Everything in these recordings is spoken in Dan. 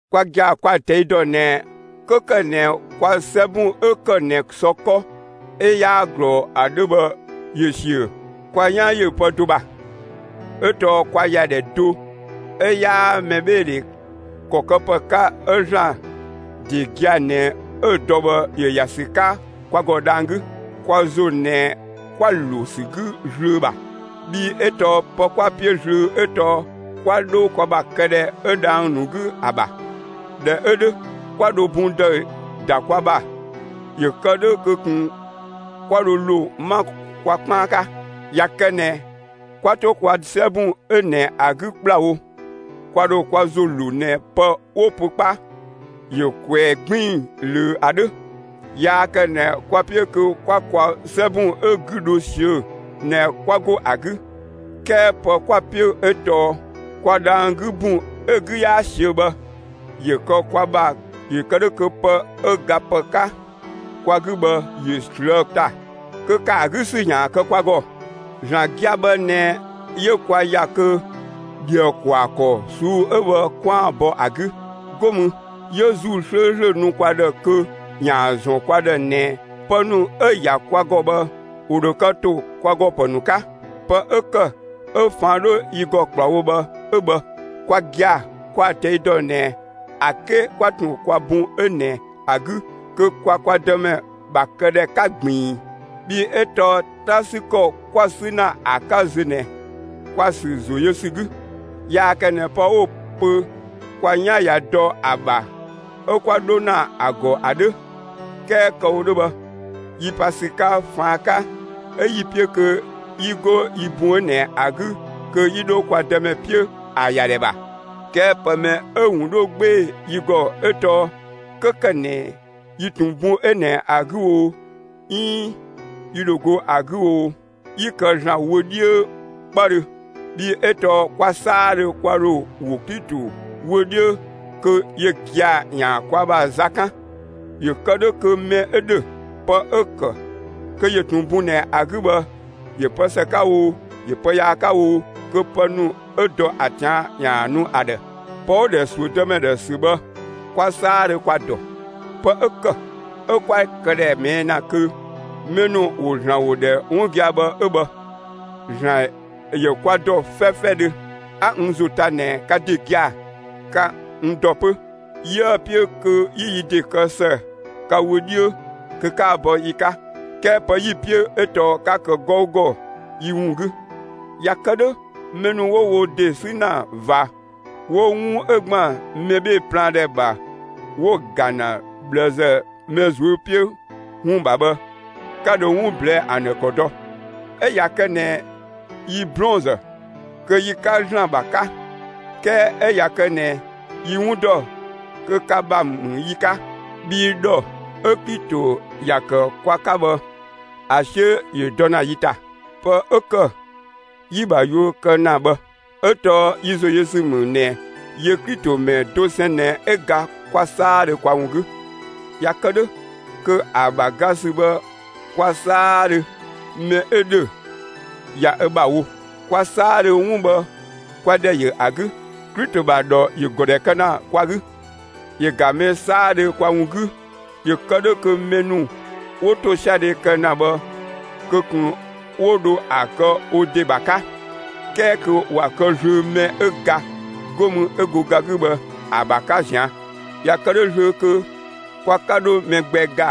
Kwa gia‑ kwa‑ ꞊tɛi' dɔ ꞊nɛ 'kö ‑kë ꞊nɛ kwa 'sɛbun 'ö ‑kë ꞊nɛ sɔ 'kɔ 'ö 'yaa ꞊glɔɔ ‑a 'dhö bhë ‑yö ‑siö, kwa 'yan ‑yö pë do ‑bha; 'ö tɔɔ kwa ‑yadhɛ do 'ö 'yaa mɛbheedhe ‑kɔ këpë 'ka 'ö ‑Zlan ‑de gia‑ ꞊nɛ 'ö‑ dɔ bhë ‑yö ‑ya ‑sü 'ka kwa ‑gɔ dhang‑ 'gü. Kwa ‑zo ꞊nɛ 'kwa‑ ‑lo ‑sü 'gü zlöö ‑bha, bhii 'ö tɔɔ pë 'kwa‑ 'piö zlöö 'ö tɔɔ 'kwa 'dho kwa ‑bha këdhɛ 'ö dhang‑ ‑nu 'gü ‑a ‑bha. ꞊Dhɛ 'ö 'dhö, 'kwa ‑dho bun ‑dëü ‑da kwa ‑bha ‑yö kë 'dhö kö ꞊kun 'kwa dho ‑lo 'ma kwa 'kpaan 'ka. ꞊Ya kë ꞊nɛ 'kwa 'to kwa 'sɛbun 'ö ꞊nɛ ‑a 'gü ‑kplawo, kwa ‑dho kwa ‑zo ‑lo ꞊nɛ pë 'wo‑ pö 'kpa ‑yö ꞊kwɛɛ‑ 'gbiin‑ ꞊löö ‑a 'dhö. Yaa kë ꞊nɛ kwa‑ 'piö kö 'kwa kwa 'sɛbun 'ö‑ 'gü dho ꞊siö'‑ ꞊nɛ 'kwa 'go ‑a 'gü; 'kɛɛ pë 'kwa‑ 'piö 'ö tɔɔ kwa dhang‑ 'gü ‑bun 'ö‑ 'gü 'yaa ꞊siö' bhë ‑yö kë kwa ‑bha ‑yö kë 'dhö kö pë 'ö gapë 'ka kwa 'gü bhë, ‑yö ꞊slëë' ‑ta kö ‑kë ‑a 'gü ‑sü ‑yaan kë kwa ‑gɔ. ‑Zlan gia‑ bhë ꞊nɛ 'yö kwa ‑ya kö ‑dhië ‑kwaa ‑kɔ ꞊suu'‑ 'ö bhë 'kwaan‑ bɔ ‑a 'gü, 'go mü 'yö ‑Zuu 'slööslö nu kwa ‑dhë kö ‑yaan ‑zɔn kwa ‑dhë ꞊nɛ pë ‑nu 'ö‑ ‑ya kwa ‑gɔ bhë ‑wo ‑dho kë ‑to kwa ‑gɔ ‑pë ‑nu 'ka. Pë 'ö ‑kë 'ö ꞊faan' 'dho yi ‑gɔ ‑kplawo bhë 'ö bhë. Kwa gia‑ kwa‑ ꞊tɛi' dɔ ꞊nɛ ‑a 'ke 'kwa ꞊tun kwa bun 'ö ꞊nɛ ‑a 'gü kö kwa kwa Dëmɛ ‑bha këdhɛ 'ka ꞊gbiin. Bhii 'ö tɔɔ 'ta 'sü ‑kɔ 'kwa‑ 'sü ‑na ‑a 'ka zö ꞊nɛ, kwa‑ ‑sü ‑zo yö ‑sü 'gü. Yaa kë ꞊nɛ pë 'wo‑ pö kwa 'yan ꞊ya dɔ ‑a ‑bha 'ö 'kwa 'dho ‑na ‑a ‑gɔ ‑a 'dhö. ('Kɛɛ kë‑ wo 'dhö bhë,) yi pa ‑sü 'ka ꞊faan' 'ka 'ö 'yi‑ 'piö kö 'yi 'go yi bun 'ö ꞊nɛ ‑a 'gü kö 'yi 'dho kwa Dëmɛ 'piö ‑a ‑yadhɛ ‑bha. 'Kɛɛ pë mɛ 'ö‑ ‑wun 'dho 'gbee‑ yi ‑gɔ 'ö tɔɔ 'kö ‑kë ꞊nɛ yi ‑tun bun 'ö ꞊nɛ ‑a 'gü oo 'iin yi ‑dho go ‑a 'gü oo, yi kë ‑Zlan wö 'dhiö 'kpëdhö. Bhii 'ö tɔɔ kwa 'saadhö kwa ‑dho ‑wo Klito wö 'dhiö kö yö gia‑ ‑yaan kwa ‑bha za 'kan, ‑yö kë 'dhö kö mɛ 'ö ‑dhö, pë 'ö‑ ‑kë kö ‑yö ꞊tun bun ꞊nɛ ‑a 'gü bhë ‑yö pë ‑së 'ka oo, ‑yö pë yaa 'ka oo, kö pë mɛ 'ö dɔ ‑a ꞊tian', ‑yaan nu ‑a ‑dhë. Pë 'wo‑ ‑dhɛ ‑suö Dëmɛ ‑dhë ‑sü bhë kwa 'saadhö kwa‑ ‑dɔ. Pë 'ö ‑kë 'ö 'kwa‑ këdhɛ ꞊mɛɛ' ‑na kö mɛ ‑nu ‑wo ‑Zlan ‑wo ‑dhɛ 'wun gia‑ bhë 'ö bhë. ‑Zlan ‑yö kwa ‑dɔ 'fɛfɛdhö; 'a n ‑zo 'ta ꞊nɛ ka ‑de gia‑ ka n ‑dɔ 'pö. 'Yië‑ 'piö kö 'yi yi ‑de kë ‑së ka wö 'dhiö kö 'kaan‑ bɔ yi 'ka 'kɛɛ pë 'yi‑ 'piö 'ö tɔɔ 'ka kë 'gɔugɔ yi ‑wun 'gü. ꞊Ya kë 'dhö mɛ ‑nu 'wo wo ‑de 'sü ‑na ꞊va, 'wo 'wun 'ö ‑gban mɛ 'bhee‑ plaan ‑dhɛ ‑bha 'wo‑ ‑ga ‑na ꞊bhlëzë mɛ ꞊zuö' 'piö ‑wun ‑bha bhë, 'ka dho 'wun ꞊blɛɛ' ‑an ‑dhë ‑kɔ dɔ. 'Ö ꞊ya kë ꞊nɛ yi 'blɔɔnzë kö yi‑ 'ka ‑Zlan ‑bha 'ka, 'kɛɛ 'ö ꞊ya kë ꞊nɛ yi 'wun ‑dɔ, kö ka ‑bha ‑mü yi 'ka. Bhii ‑dhɔ 'ö Klito ‑ya ‑kë kwa 'ka bhë, ‑a 'siö ‑yö dɔ ‑na yi ‑ta; pë 'ö ‑kë 'yi‑ ‑bha yuö kë ‑na bhë. 'Ö tɔɔ yi ‑zoyösü ‑mü ꞊nɛ yö Klito ‑mɛ dosɛn ꞊nɛ 'ö ga kwa 'saadhö kwa ‑wun 'gü; ꞊ya kë 'dhö kö ‑a ‑bha ga ‑sü bhë kwa 'saadhö, mɛ 'ö ‑dhö ꞊ya ö ‑bha wo. Kwa 'saadhö, 'wun bhë 'kwa ‑dhɛ yö ‑a 'gü, Klito ‑bha ‑dhɔ ‑yö ‑gɔ ‑dhɛ kë ‑na kwa 'gü. ‑Yö ‑ga mɛ 'saadhö kwa ‑wun 'gü ‑yö kë 'dhö kö mɛ ‑nu 'wo ‑tosiadhe kë ‑na bhë kö ꞊kun 'wo dho ‑a kë wo ‑de ‑bha 'ka, 'kɛɛ kö ‑wa kë zlöö mɛ 'ö ga, 'go mü 'ö go ga 'gü bhë ‑a ‑bha 'ka ꞊zian'. ꞊Ya kë 'dhö zlöö kö kwa 'ka 'dho mɛ gbɛ ‑ga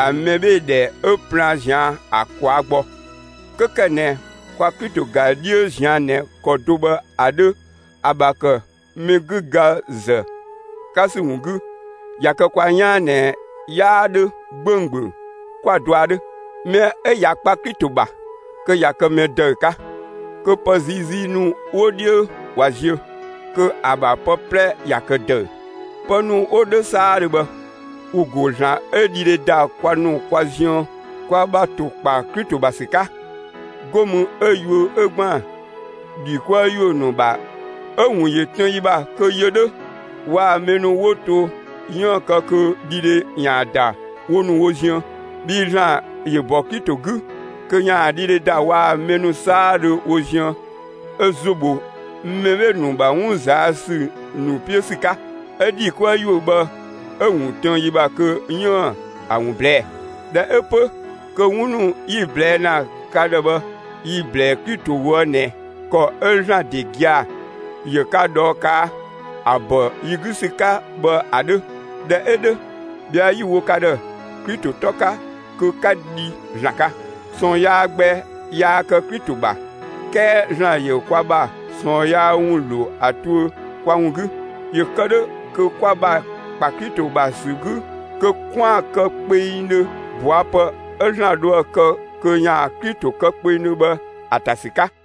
‑a mɛbheedhɛ 'ö plaan ꞊zian' ‑a ‑kwaa gbɔ; 'kö ‑kë ꞊nɛ kwa Klito ‑ga 'dhiö ꞊zian' ꞊nɛ ‑kɔ do bhë ‑a 'dhö ‑a ‑bha ‑kë mɛ 'gü ga ‑zë 'ka ‑sü ‑wun 'gü, ꞊ya kë kwa 'yaan ꞊nɛ 'yaa 'dhö 'gbönggböng, 'kwa‑ dɔa 'dhö. Mɛ 'ö ꞊ya kpa Klito ‑bha kö ꞊ya kë mɛ ‑dëü 'ka, kö pë ziizii ‑nu 'wo 'dhiö ꞊wa ziö; kö ‑a ‑bha pë 'plɛ ꞊ya kë ‑dëü. Pë ‑nu 'wo 'dhö 'saadhö bhë, ‑wo ‑go ‑Zlan 'ö dhidhe ‑da kwa ‑nu kwa ziën kwa ‑bha ‑kpa Klito ‑to ‑bha ‑sü 'ka, 'go mü 'ö yuö 'ö ‑gban ‑dhi 'kuë‑ ‑yuö ‑nu ‑bha 'ö‑ ‑wun tën yi ‑bha kö yö 'dhö waa‑ mɛ ‑nu 'wo to 'yiën‑ kë kö dhidhe ‑yaan ‑da wo ‑nu wo ziën. Bhii ‑Zlan ‑yö ‑bɔ Klito 'gü kö ‑yaan dhidhe ‑da waa‑ mɛ ‑nu 'saadhö wo ziën ö ‑zo ‑bho mɛ 'bhee‑ ‑nu ‑bha 'wun ꞊zaa' ‑sü ‑nu 'piö ‑sü 'ka; 'ö ‑dhi 'kuë‑ ‑yuö bhë 'ö‑ ‑wun tën yi ‑bha kö 'yiën‑ ‑a ‑wun ꞊blɛɛ'‑. ꞊Dhɛ 'ö 'pö kö 'wun ‑nu 'yi‑ ꞊blɛɛ' ‑na ka ‑dhë bhë yi‑ ‑blɛɛ Klito ꞊woë' ꞊nɛ ‑kɔ 'ö ‑Zlan ‑de gia‑ ‑yö ka ꞊dhɔɔ ꞊kaa' ‑a ‑bɔ yi 'gü ‑sü 'ka bhë ‑a 'dhö. ꞊Dhɛ 'ö 'dhö ꞊bhɛa' 'yi‑ wo ka ‑dhë Klito 'tɔ 'ka kö 'ka dhi ‑Zlan 'ka. ꞊Sɔɔn yaa gbɛ yaa kë Klito ‑bha, 'kɛɛ ‑Zlan ‑yö kwa ‑bha ꞊sɔɔn yaa ‑wun ‑lo ‑a tuö kwa ‑wun 'gü, ‑yö kë 'dhö kö kwa ‑bha ‑kpa Klito ‑bha ‑sü 'gü kö 'kwaan‑ kë kpengdhö ꞊bɔa' pë 'ö ‑Zlan dhoë‑ kë kö ‑yaan Klito kë kpengdhö bhë ‑a ‑ta ‑sü 'ka.